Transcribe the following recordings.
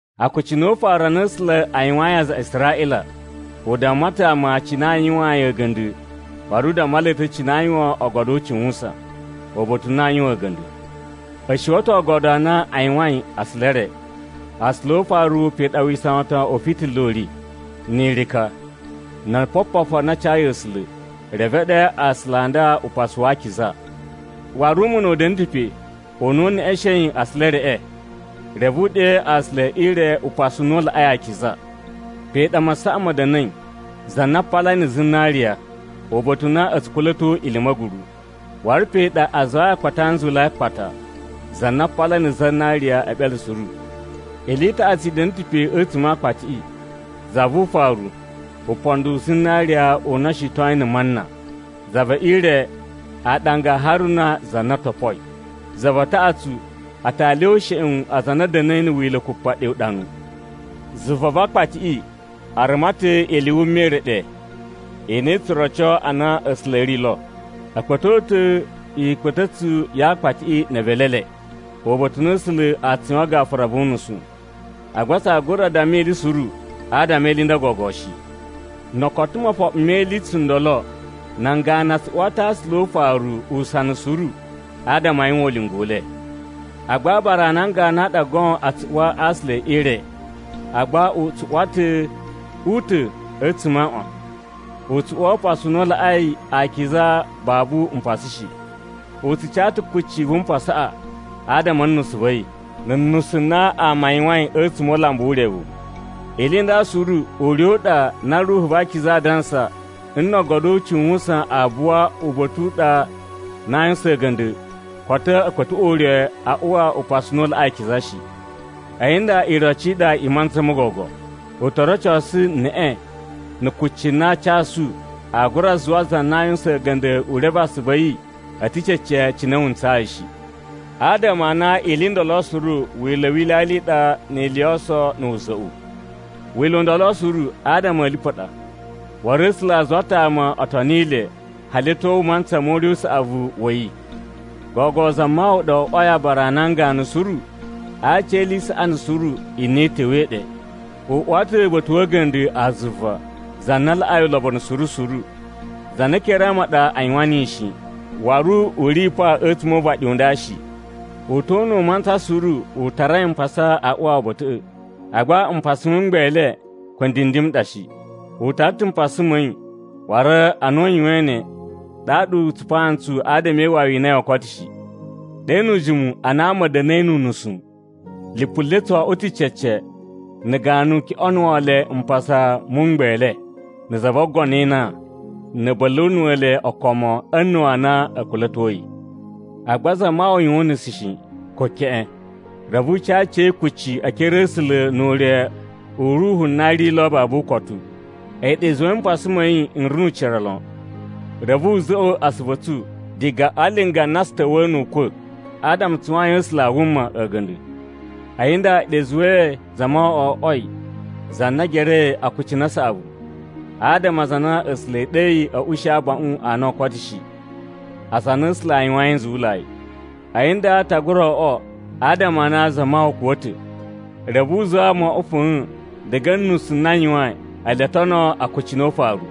Akucunu o ufaru a na A̱sula̱ a yuwayin aza a Israꞌila, u damma ta̱ ama cine aa yuwaan yi a̱ga̱nda̱ waru u damma le ta̱ cine aa yuwan Oogodo o Ucuwusan, uba̱ta̱ u na aa yuwan a̱ga̱nda̱. A̱ shuwa̱ ta̱ oogodo a na a yuwain asula e re. A aasula o ufaru pe ɗa wisawatan u fitila u ri, ni irika, no opopofu a na a cayi A̱sula̱. Reve e ɗe aasula a nda Upasu wa Akiza. Waru umuna u da̱na̱ ta̱ pe u na u neꞌeshein asula e reꞌe. Reve e ɗe aasula e ire Upasu u na u Laꞌai Akiza. Pe ɗa masaꞌa ma̱ da̱na̱i, za na a palai na̱ zinariya, uba̱ta̱ u na a̱ tsu kula̱to ili i ma̱guru. Waru pe ɗa a zuwai Akpati a Nzuwulai a akpata, za na a palai na̱ zinariya e eɓele suru. Ili i taꞌatsu i da̱na̱ ta̱ pe a̱tsuma̱ a Akpatiꞌi: Za vu ufaru, upondo u zinariya u na o shitoyin na̱ mana. Za ve ire, aaɗanga a Haruna za na topoi. Za va taꞌatsu, atali o usheꞌun aza a na a̱ da̱na̱i na̱ Wila̱ Kupa ɗe uɗanu. Zuva va Aakpatiꞌi a ruma ta̱ ili i wuma i re ɗe i na i tsu roco a na A̱sula̱ a̱ ri lo. A kpa̱to ta̱ ikpa̱ta̱tsu ya Aakpatiꞌi ne evelu e le, uba̱ta̱ u na A̱sula̱ a tsu yuwan gafura vu unusu. Agba tsaa gura damma ili suru adama e ili i nda gogo shi. No o koto mofoɓo me ili tsundolo, nan ganu a tsu uwa ta̱ a aasula o ufaru usana suru adama a yuwan ulinga u le. Agba aabara a nan ganu a ɗa goon tsu uwa a aasula e ire, agba u tsu uwa ta̱ u ta̱ a̱tsuma̱ a aaꞌwan. U tsu uwa Upasu u na u Laꞌai Akiza babu mpasa shi. U tsu ca ta̱ kucci vu mpasaꞌa adama a̱ nusu va̱ yi, na̱ nusu na ama a yuwain a̱tsuma̱ o ulambu wu urevu. Ili i nda suru ure u ɗa na Ruhu va Akiza aa dansa nna̱ Oogodo o Ucuwusan a buwa uba̱ta̱ u ɗa u na aa yuwusan a̱ga̱nda̱, koto a̱ kpa̱tuꞌwa̱ ure a uwa Upasu u na u Laꞌai Akiza shi. A̱yi nda iroci i ɗa i mantsa mo gogo. U to rocosu neꞌe na̱ kucci na a casu aa gura zuwa za na a yuwusan a̱ga̱nda̱ u reve asuvu a̱ yi a̱ ta̱ cece cine wu ntsayi shi. Adama a na ili i ndolo suru wila̱ wi ilyalya i ɗa ni ili yo oso na̱ wuza̱ꞌu. Wila̱ u ndolo suru adama a̱ lipu a ɗa, waru A̱sula̱ a zuwa ta̱ ama o toni le hali a̱ tyo mantsa mo ure u saꞌavu wa̱ yi. Gogo Zamawawa ɗa o oꞌwoi aabara a nan ganu suru a aci e ili i saꞌani suru i na i ta̱wa̱i ɗe. U uwa ta̱ uba̱ta̱ wa̱ a̱ga̱nda̱ a zuva za na laꞌai ulobonu suru suru, za na ekere a ama a ɗa a yuwan niyi shi, waru u ri pa a̱tsuma̱ o uvaɗi u nda shi. U ta̱ o una̱ u mantsa suru u tarai mpasa a uwa uba̱ta̱ꞌa̱, agba mpasa mu mgbele ko ndindim n ɗa shi. U tara ta̱ mpasa ma̱ yi, waru ana u yuwain ne, ɗaɗa u tsupaa ntsu adama e iwawi i na yoo koto shi. Ɗe nu ujimu, ana ama a̱ da̱na̱i nu unusu, lipu le tso oꞌwo ta̱ cece na̱ ganu kyoꞌonuwo le mpasa mu mgbele na̱ za vo ogono e inan, na̱ a̱ bula̱nuwa̱ le okomo a̱ a̱na̱wu a nan na a̱ kula̱toi. Agba Zamawawa yuwan unusu shi, ko keꞌen, reve u ca aciya̱yi kucci e ekere a̱ A̱sula̱ nu ure u Ruhu na ri lo babu ukotu. A̱yi ɗa i zuwai mpasa ma̱ yi n ri nu ucira lon, reve wu za̱ꞌwa̱ asuvu a̱ tsu diga a linga na tsu ta̱wa̱a̱ nu ukwa̱. Adama tsu yuwayin A̱sula̱ a wuma a̱ga̱nda̱! A̱yi nda a̱yi ɗa i zuwai Zamawawa o oꞌwoi za na gerei akucunu a saꞌavu, adama aza a na A̱sula̱ e ɗeyi a̱ ushi abaꞌun a na oo koto shi, aza a na A̱sula̱ a yuwayin nzuwulai. A̱yi nda ta gura oꞌwo adama a na Zamawawa kuwa̱ ta̱, reve u zuwa ama o oꞌwo fa̱a̱n diga a̱ nusu na a yuwain ele o tono akucunu o ufaru.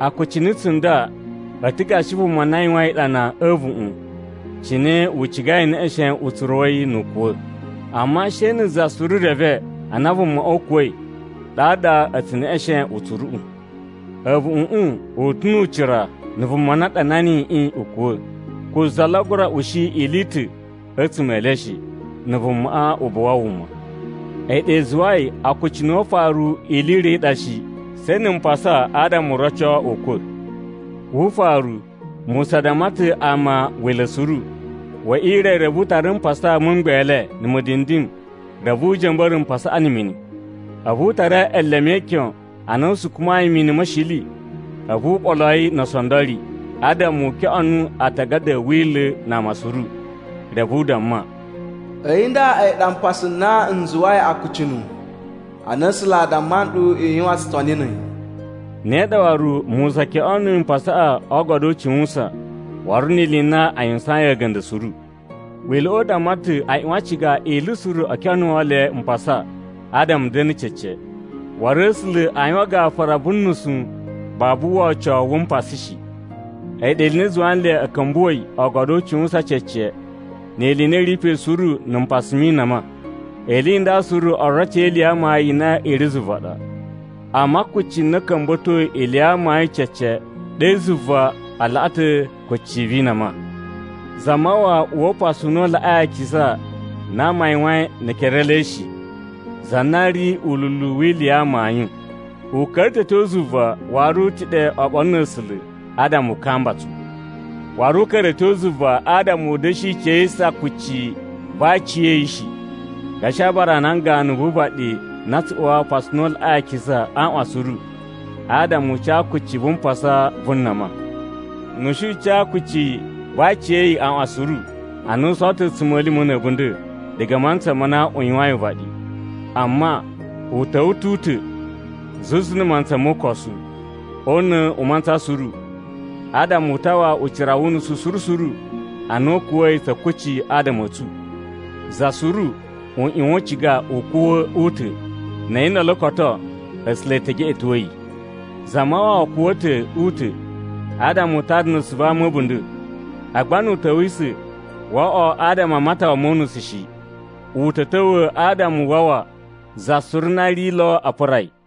Akucunu tsunda a̱ ta̱ gashi vuma na yuwain iɗana a̱ a̱a̱vuꞌun cine u cigai e neꞌeshen utsuru wa̱ yi nu u kuwa̱. Amma she na̱ za suru reve ana vumaꞌa u kuwa̱i ɗaɗa a̱ tsu neꞌeshen utsuruꞌu. A̱vuꞌuꞌun u ta̱ nu ucira na̱ vuma na ɗana niyiꞌi u kuwa̱. Ko za lo a gura ushi ili i ta̱ a̱tsuma̱ e le shi, na̱ vumaꞌa u buwa wuma. A̱yi ɗa i zuwai akucunu o ufaru ili i ro i ɗa shi, she na̱ mpasa adama u roco ukwa̱. Wu ufaru, Musa damma ta̱ ama Wila̱ suru. We ire, reve u tara mpasa mu mgbele na̱ mudindim reve u ja̱mba̱ra̱ mpasaꞌa na̱ mini. A̱vu u tara eleme e ikyon a na a sukumayi mini ma̱ shili a̱vu u ɓolo yi no oosondori adama u kyoꞌonuwo aatagada a̱ Wila̱ na ama suru. Reve u damma, “A̱yi nda a̱yi ɗa mpasa n na n zuwai Akucunu a na A̱sula̱ a damma nɗu i yuwan tsutoni na̱ a̱yi.” Ne ɗa waru, Musa kyoꞌonuyi mpasaꞌa o Oogodo o Ucuwusan waru ni ili i na a yuwusayin a̱ga̱nda̱ suru. Wila̱ꞌa̱ u damma ta̱ a ꞌyuwan a ciga ili suru o kyoꞌonuwo le mpasa adama a̱ da̱na̱ cece. Waru A̱sula̱ aa yuwan gafura vu nusu babu wocowu wu mpasa shi. A̱yi ɗa ili i na i zuwa nle a̱ ka̱mbuwa̱i Oogodo o Ucuwusan cece ni ili i na i ri pe suru na̱ mpasa mi inama. Ili i nda suru oroci e ili ya amayun i na i ri zuva ɗa. Amma kucci na ka̱mba̱toi ili ya amayun cece ɗe zuva a laꞌa ta̱ kucci vi inama. Zamawawa uwa Upasu u na u Laꞌai Akiza na ama a yuwain ne ekere e le shi, za na ri ululu wi ili ya amayun. U ka̱ra̱ ta̱ a̱ tyo zuva waru u ta̱ ɗe oɓolo na̱ A̱sula̱ adama u kamba tsu. Waru u ka̱ra̱ a̱ tyo zuva adama u da̱shi cayisa kucci va aciya̱yi shi, gashi aabara a nan ganu vu uvaɗi na tsu uwa Upasu u na u Laꞌai Akiza a aaꞌwan suru adama u ca kucci vu mpasa vu nama. Nu u shi u ca kucci va aciya̱yi aaꞌwan suru, a na u sowo ta̱ a̱tsuma̱lima̱ na̱ a̱bunda̱ diga a mantsa ma na a yuwain uvaɗi. Amma, u ta̱wa̱ ta̱ u ta̱, zuzu na̱ mantsa mo ukosu, o una̱ u mantsa suru, adama u tawa ucira wu unusu suru suru ana u kuwa̱i tsa̱ kucci adama a̱ tsu. Za suru u ꞌyuwan u ciga u kuwa̱ u ta̱, na̱ a̱yi ndolo koto, A̱sula̱ e te geꞌeto yi. Zamawawa kuwa̱ ta̱ u ta̱ adama u tara nusu va ama a̱ a̱bunda̱. Agba nu u ta̱wisa̱, woo oꞌwo adama a matawa mo unusu shi. U ta̱ ta̱wa̱ adama u wawa za suru na ri lo a pura yi.